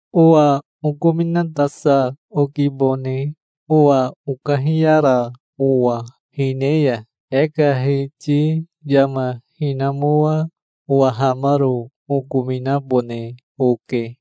Owa okominatasa okibone owa okahiyara owa hine ya. E ka hiti yama hinamoa owahamaro okominabone oke.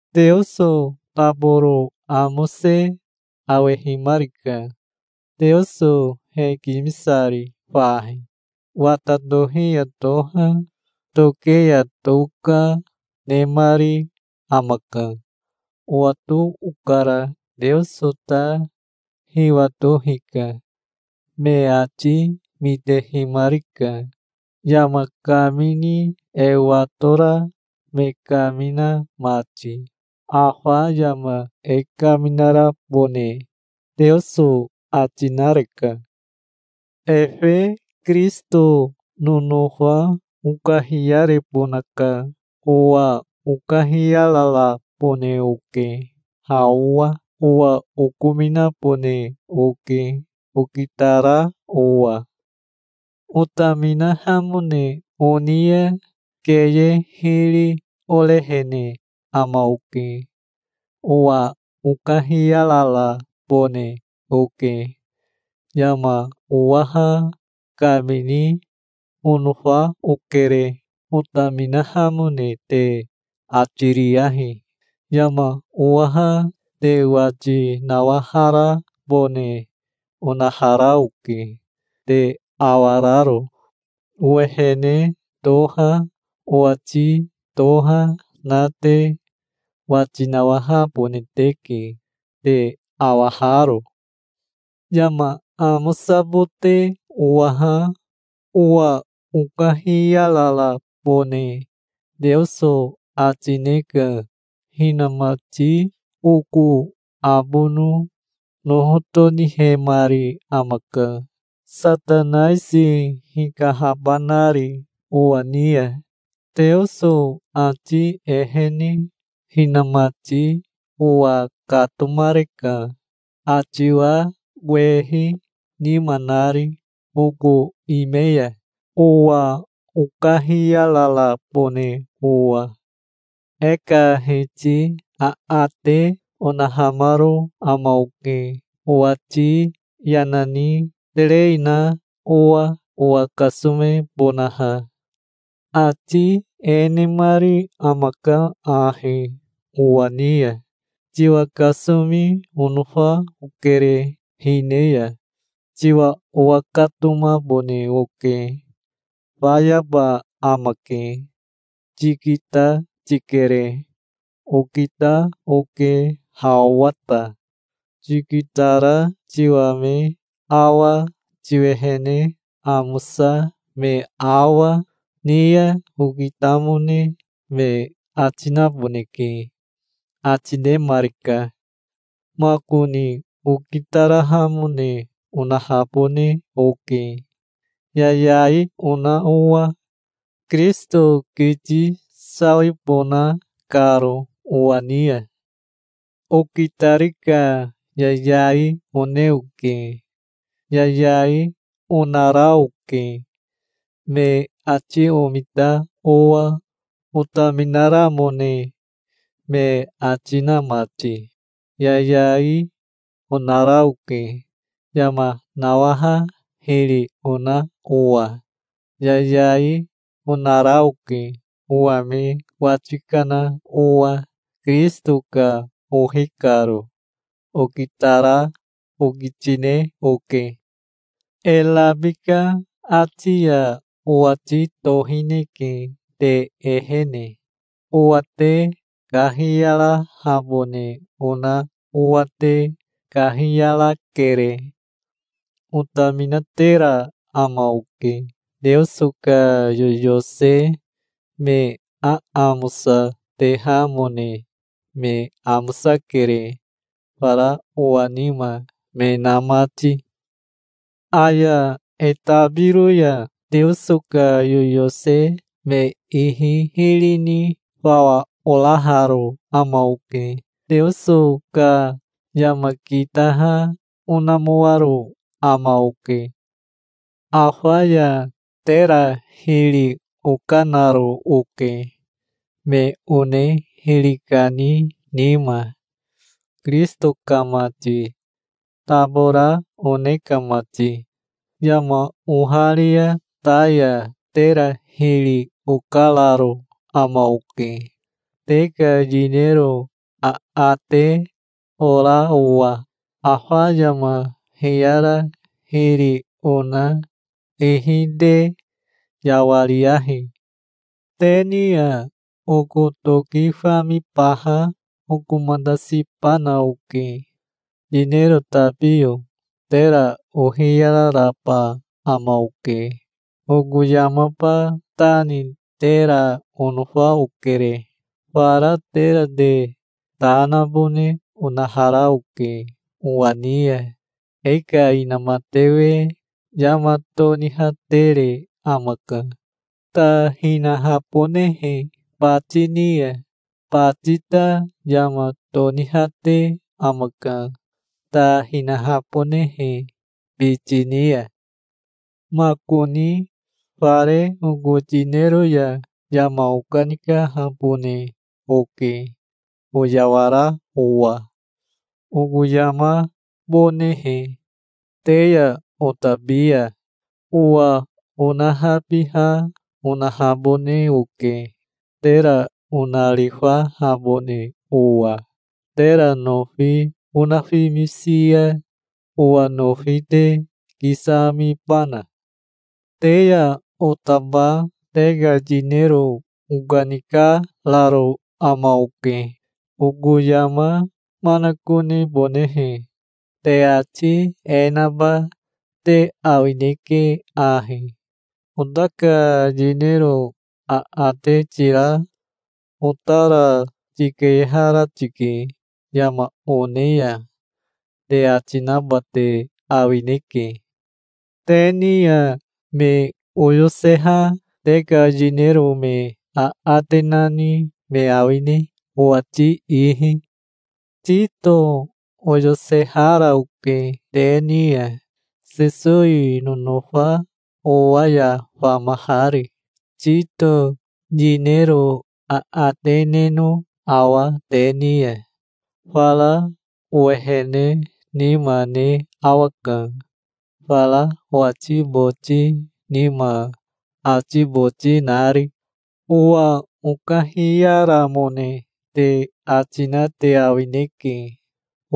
Teoso taboro amose awehimarika, Teoso hekimisari fahi. Wata tohi ya toha, toke ya toka, nemari amaka. Owato okara. Teoso ta hiwato hika. Me ati mitehimarika, yama kamini e watora me kamina mati. Afa yama e kaminarabone Teoso ati nareka. Efe Kirisito nonofa okahiyarebonaka. Owa okahiyararabone oke ha owa. Owa okominabone oke, okitara owa. Otaminahamone oni ya keye hiri orehene ama oke. Owa okahiyararabone oke. Yama owaha kamini onofa okere. Otaminahamone te ati riyahi. Yama owaha te wati nawaharabone onahara oke, te awararo. Owehene toha owati toha na te wati nawahabone teke, te awaharo. Yama amosabote owaha, owa okahiyararabone Teoso ati ne ka hinamati oko abono noho tonihemari amaka, Satanaisi hikahabanari owa ni ya. Teoso ati ehene hinamati owa katomareka, atiwa wehi nima nari oko ime ya, owa okahiyararabone owa. E ka Hiti aate onahamaro ama oke, owati yana ni terei na owa, owa kasomebonaha. Ati e nemari amaka ahi owa ni ya: "Tiwa kasomi onofa okere. Hine ya tiwa owakatomabone oke. Fayaba amake. Tikita tikere. Okita oke ha owa ta. Tikitara tiwa me awa tiwehene amosa me awa, ni ya okitamone me ati naboneke", ati nemarika. Makoni okitarahamone onahabone oke, yayai ona owa, Kirisito kiti sawibona karo owa ni ya. Okitari ka yayai one oke. Yayai, onara oke, me ati omita owa, otaminaramone me ati na mati. Yayai, onara oke, yama nawaha hiri ona owa. Yayai, onara oke, owa me wati kana owa, Kirisito ka ohi karo. Okitara okitine oke. E rabika ati ya owati tohineke te ehene. Owa te kahiyarahabone ona owa te kahiyarakere. Otaminatera ama oke. Teoso ka yoyose me aamosa tehamone me amosakere, fara owa nima me na mati. Aya e tabiro ya Teoso ka yoyose me ihi hiri ni fawa oraharo ama oke. Teoso ka yama kitaha onamoaro ama oke. Afa ya tera hiri okanaro oke, me one hiri kani nima, Kirisito ka mati, tabora one ka mati. Yama oharia ta ya tera hiri okararo ama oke, te ka yinero aate ora owa. Afa yama hiyara hiri ona ihi te yawariyahi. Te ni ya oko toki famibaha okomatasibana oke. Yinero tabiyo tera ohiyararaba ama oke. Oko yamaba ta ni tera onofa okere. Fara tera te ta nabone onahara oke owa ni ya. E ka inamatewe yama tonihatere amaka, ta hinahabonehe bati ni ya. Bati ta yama tonihate amaka, ta hinahabonehe biti ni ya. Makoni fare oko yinero ya yama okanikahabone oke oyawara owa oko yamabonehe te ya otabi ya. Owa onahabiha onahabone oke, tera onarifahabone owa. Tera nofi onafimisi ya owa nofi te kisamibana? Te ya otaba te ka yinero okanikararo ama oke, oko yama manakonebonehe. Te ati e naba te awineke ahi: "Ota ka yinero aate tira otara tikeyehara tike yama one ya", te ati naba te awineke. Te ni ya me oyoseha te ka yinero me aate nani me awine, owati ihi? Tito oyosehara oke te ni ya, Sesowi nonofa owa ya famahari. Tito yinero aate neno awa te ni ya? Fara owehene nima ne awaka, fara owati boti nima ati boti nari. Owa okahiyaramone te ati na te awineke.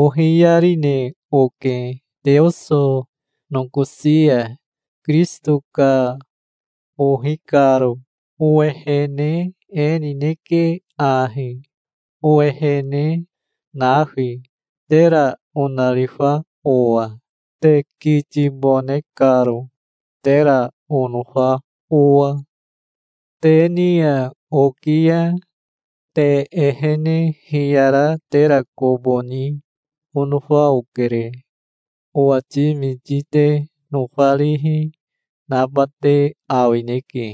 Ohiyarine oke Teoso nokosi ya, Kirisito ka ohi karo. Owehene e nineke ahi, owehene nafi, tera onarifa owa, te kitibone karo, tera onofa owa. Te ni ya oki ya te ehene hiyara tera kobo ni onofa okere. Owati miti te nofarihi naba te awineke.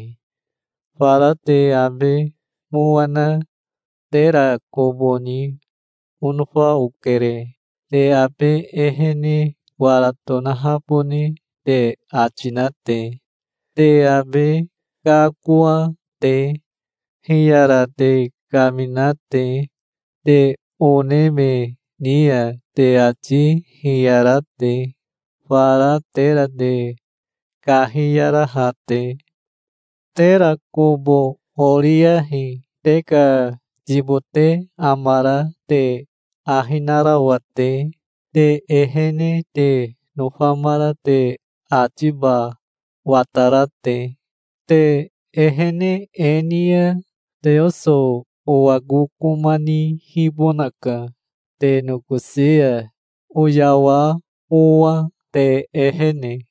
Fara te abe mowa na tera kobo ni onofa okere, te abe ehene wara tonahabone te ati na te, te abe kakoa te, hiyara te kamina te, te one me ni ya te ati hiyara te, fara tera te kahiyaraha te. Tera kobo oriyahi te ka yibote amara te ahi narawa te, te ehene te nofamara te atiba watara te. Te ehene e ni ya Teoso owa kokoma nihibonaka te nokosi ya, oyawa owa te ehene.